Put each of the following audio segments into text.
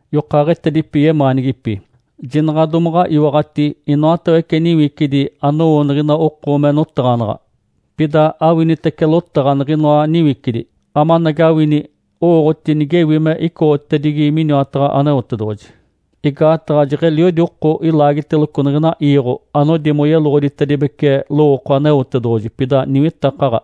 Yokaaɡ̶etedipi yemaanigipi. Jinaɡ̶a domaɡ̶a iwaɡ̶ati inoatawece niwicidi anowo niɡ̶ina oko me notaɡ̶anaɡ̶a. Pida awinitece lotaɡ̶a niɡ̶inoa niwicidi, amanagawini owooɡ̶oti nigewi me icoɡ̶otedigi miniwataɡ̶a Aneotedoɡ̶oji. Igaataɡ̶a jeɡ̶eliodi oko ilaagiteloco niɡ̶ina iiɡ̶o anodi moyeloɡ̶oditedibece lowooko Aneotedoɡ̶oji, pida niwitakaɡ̶a.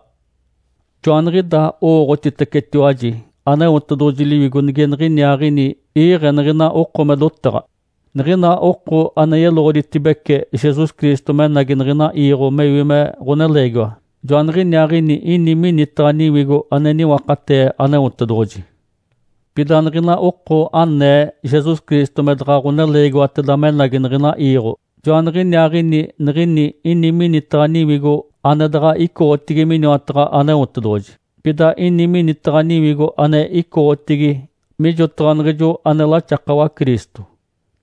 Joaniɡ̶idaa owooɡ̶otitecetiwaji Aneotedoɡ̶oji Liwigo nige niɡ̶iniaaɡ̶ini iiɡ̶e niɡ̶ina oko me dotaɡ̶a. Niɡ̶ina oko ane yeloɡ̶oditibece Jesus Cristo menagi niɡ̶ina iiɡ̶o mewi me ɡ̶oneleegiwa, joaniɡ̶iniaaɡ̶ini ini minitaɡ̶a Niwigo, ane niwakatee Aneotedoɡ̶oji. Pida niɡ̶ina oko anee Jesus Cristo me daɡ̶a ɡ̶oneleegiwateda menagi niɡ̶ina iiɡ̶o, joaniɡ̶iniaaɡ̶ini niɡ̶ini ini minitaɡ̶a niwigo ane daɡ̶a icoɡ̶otigi miniwataɡ̶a Aneotedoɡ̶oji. Pida ini minitaɡ̶a niwigo ane icoɡ̶otigi mijotaɡ̶a niɡ̶ijo ane laxakawa Cristo.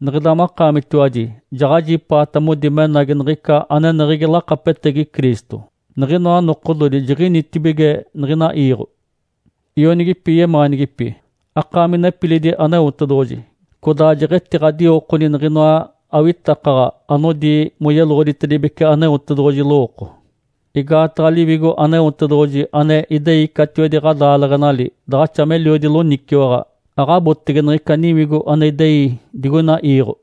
Niɡ̶ida makaamitiwaji jaɡ̶ajipaata modi menagi niɡ̶ica aneneɡ̶egi lakapetegi Cristo, niɡ̶inoa nokododi jiɡ̶initibige niɡ̶ina iiɡ̶o. Ionigipi yemaanigipi. Akaami nepilidi Aneotedoɡ̶oji, codaa jeɡ̶etiɡ̶adiwokoni niɡ̶inoa awitakaɡ̶a anodi moyeloɡ̶oditedibece Aneotedoɡ̶oji lowooko. Igaataɡ̶a Liwigo Aneotedoɡ̶oji ane idei catiwedi ɡ̶adaaleɡ̶enali daɡ̶axa meliodi loniciwaɡ̶a, aɡ̶abotege niɡ̶ica niwigo ane idei digoina iiɡ̶o.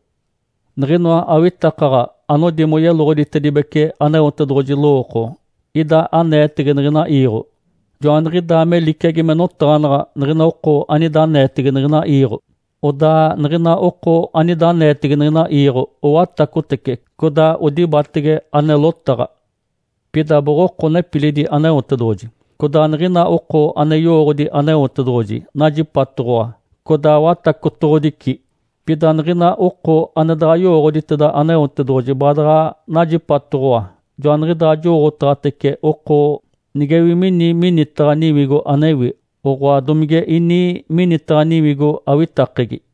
Niɡ̶inoa awitakaɡ̶a anodi moyeloɡ̶oditedibece Aneotedoɡ̶oji lowooko ida aneetege niɡ̶ina iiɡ̶o. Joaniɡ̶idaa me liciagi me notaɡ̶anaɡ̶a niɡ̶ina oko anida aneetege niɡ̶ina iiɡ̶o. Odaa niɡ̶ina oko anida aneetege niɡ̶ina iiɡ̶o owatacotece, codaa odibatege ane lotaɡ̶a. Pida boɡ̶oko nepilidi Aneotedoɡ̶oji. Codaa niɡ̶ina oko ane yowooɡ̶odi Aneotedoɡ̶oji najipatoɡ̶owa, codaa watacotoɡ̶odici. Pida niɡ̶ina oko ane daɡ̶a yowooɡ̶oditeda Aneotedoɡ̶oji baadaɡ̶a najipatoɡ̶owa. Joaniɡ̶idaa jowooɡ̶otaɡ̶atece oko nigewi mini minitaɡ̶a Niwigo anewi, oɡ̶oa, domige ini minitaɡ̶a niwigo awitakegi.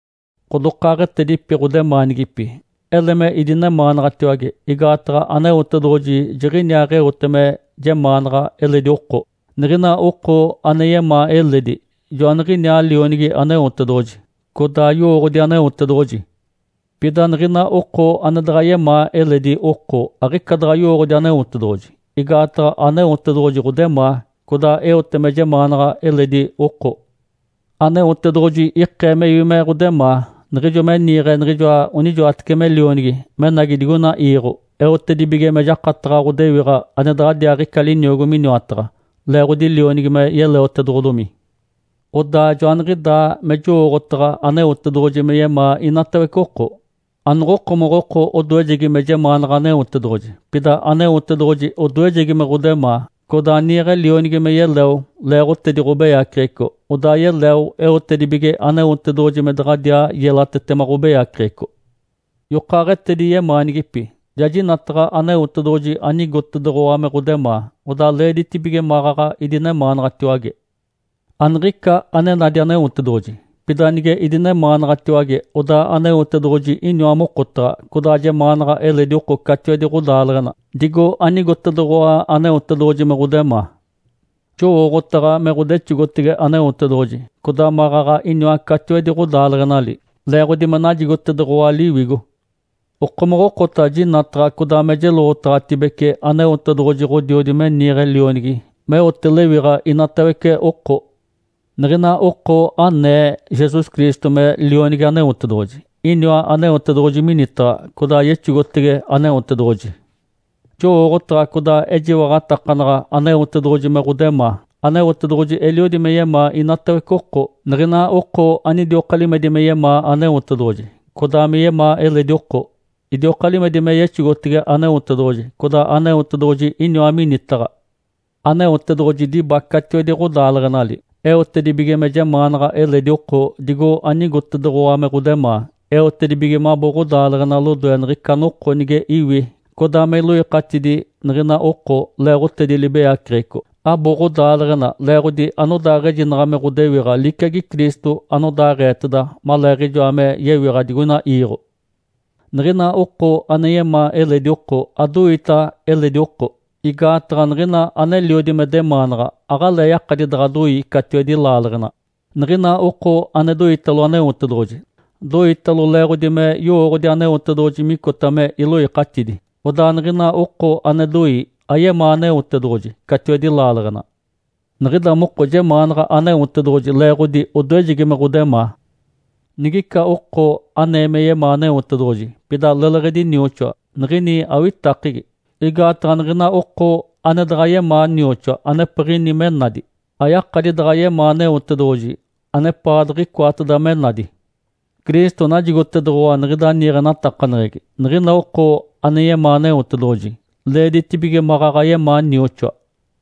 Ǥodokaaɡ̶etedipi ɡ̶odemaanigipi. Ele me idinemaanaɡ̶atiwage, igaataɡ̶a Aneotedoɡ̶oji jiɡ̶iniaaɡ̶eote me jemaanaɡ̶a eledi oko. Niɡ̶ina oko ane yemaa eledi, joaniɡ̶iniaa lionigi Aneotedoɡ̶oji, codaa yowooɡ̶odi Aneotedoɡ̶oji. Pida niɡ̶ina oko ane daɡ̶a yemaa eledi oko aɡ̶ica daɡ̶a yowooɡ̶odi Aneotedoɡ̶oji, igaataɡ̶a Aneotedoɡ̶oji ɡ̶odemaa, codaa eote me jemaanaɡ̶a eledi oko. Aneotedoɡ̶oji ikee mewi me ɡ̶odemaa niɡ̶ijo me niiɡ̶e niɡ̶ijoa onijoatece me Lionigi menagi digoina iiɡ̶o eotedibige me jakataɡ̶a ɡ̶odewiɡ̶a ane daɡ̶adiaaɡ̶ica liniogo miniwataɡ̶a, leeɡ̶odi Lionigi me yeleotedoɡ̶odomi. Odaa joaniɡ̶idaa me jowooɡ̶otaɡ̶a Aneotedoɡ̶oji me yemaa inatawece oko. Anoɡ̶okomoɡ̶oko odoejegi me jemaanaɡ̶a Aneotedoɡ̶oji, pida Aneotedoɡ̶oji odoejegi me ɡ̶odemaa, codaa niiɡ̶e Lionigi me yeleo leeɡ̶otedi ɡ̶obeyaceɡ̶eco, odaa yeleo eotedibige Aneotedoɡ̶oji me daɡ̶adiaa yelatetema ɡ̶obeyaceɡ̶eco. Yokaaɡ̶etedi yemaanigipi. Ja jinataɡ̶a Aneotedoɡ̶oji anigotedoɡ̶owa me ɡ̶odemaa, odaa leeditibige maɡ̶aɡ̶a idinemaanaɡ̶atiwage. Aniɡ̶ica ane nadi Aneotedoɡ̶oji. Pida nige idinemaanaɡ̶atiwage, odaa Aneotedoɡ̶oji iniwa mokotaɡ̶a, codaa jemaanaɡ̶a eledi oko catiwedi ɡ̶odaaleɡ̶ena digo anigotedoɡ̶owa Aneotedoɡ̶oji me ɡ̶odemaa. Jowooɡ̶otaɡ̶a me ɡ̶odexogotege Aneotedoɡ̶oji, codaa maɡ̶aɡ̶a iniwa catiwedi ɡ̶odaaleɡ̶enali, leeɡ̶odi me najigotedoɡ̶owa Liwigo. Okomoɡ̶okota jinataɡ̶a codaa me jeloɡ̶otaɡ̶atibece Aneotedoɡ̶oji Ǥodiodi me niiɡ̶e Lionigi meote lewiɡ̶a inatawece oko. Niɡ̶ina oko anee Jesus Cristo me Lionigi Aneotedoɡ̶oji, iniwa Aneotedoɡ̶oji minitaɡ̶a, codaa yexogotege Aneotedoɡ̶oji. Jowooɡ̶otaɡ̶a, codaa ejiwaɡ̶atakanaɡ̶a Aneotedoɡ̶oji me ɡ̶odemaa. Aneotedoɡ̶oji eliodi me yemaa inatawece oko. Niɡ̶ina oko anidioka limedi me yemaa Aneotedoɡ̶oji, codaa me yemaa eledi oko, idioka limedi me yexogotege Aneotedoɡ̶oji, codaa Aneotedoɡ̶oji iniwa minitaɡ̶a. Aneotedoɡ̶oji diba catiwedi ɡ̶odaaleɡ̶enali eotedibige me jemaanaɡ̶a eledi oko digo anigotedoɡ̶owa me ɡ̶odemaa, eotedibige mabo ɡ̶odaaleɡ̶ena lodoe niɡ̶ica noko nige iwi codaa me iloikatidi niɡ̶ina oko leeɡ̶otedi libeyaceɡ̶eco. Abo ɡ̶odaaleɡ̶ena leeɡ̶odi anodaaɡ̶ejinaɡ̶a me ɡ̶odewiɡ̶a liciagi Cristo anodaaɡ̶eeteda maleeɡ̶ijoa me yewiɡ̶a digoina iiɡ̶o. Niɡ̶ina oko ane yemaa eledi oko adoita eledi oko. Igaataɡ̶a niɡ̶ina aneliodi me demaanaɡ̶a, aɡ̶alee yakadi daɡ̶a doi catiwedi laaleɡ̶ena. Niɡ̶ina oko ane doitalo Aneotedoɡ̶oji, doitalo leeɡ̶odi me yowooɡ̶odi Aneotedoɡ̶oji micota me iloikatidi. Odaa niɡ̶ina oko ane doi, ayemaa Aneotedoɡ̶oji catiwedi laaleɡ̶ena. Niɡ̶ida moko jemaanaɡ̶a Aneotedoɡ̶oji leeɡ̶odi odoejegi me ɡ̶odemaa. Nigica oko anee me yemaa Aneotedoɡ̶oji, pida leleɡ̶edi nioxoa, niɡ̶ini awitakegi. Igaataɡ̶a niɡ̶ina oko ane daɡ̶a yemaa nioxoa anepiɡ̶ini me nadi, ayakadi daɡ̶a yemaa Aneotedoɡ̶oji anepaɡ̶a diɡ̶icoateda me nadi. Cristo najigotedoɡ̶owa niɡ̶ida niiɡ̶enatakaneɡ̶egi, niɡ̶ina oko ane yemaa Aneotedoɡ̶oji, leeditibige maɡ̶aɡ̶a yemaa nioxoa.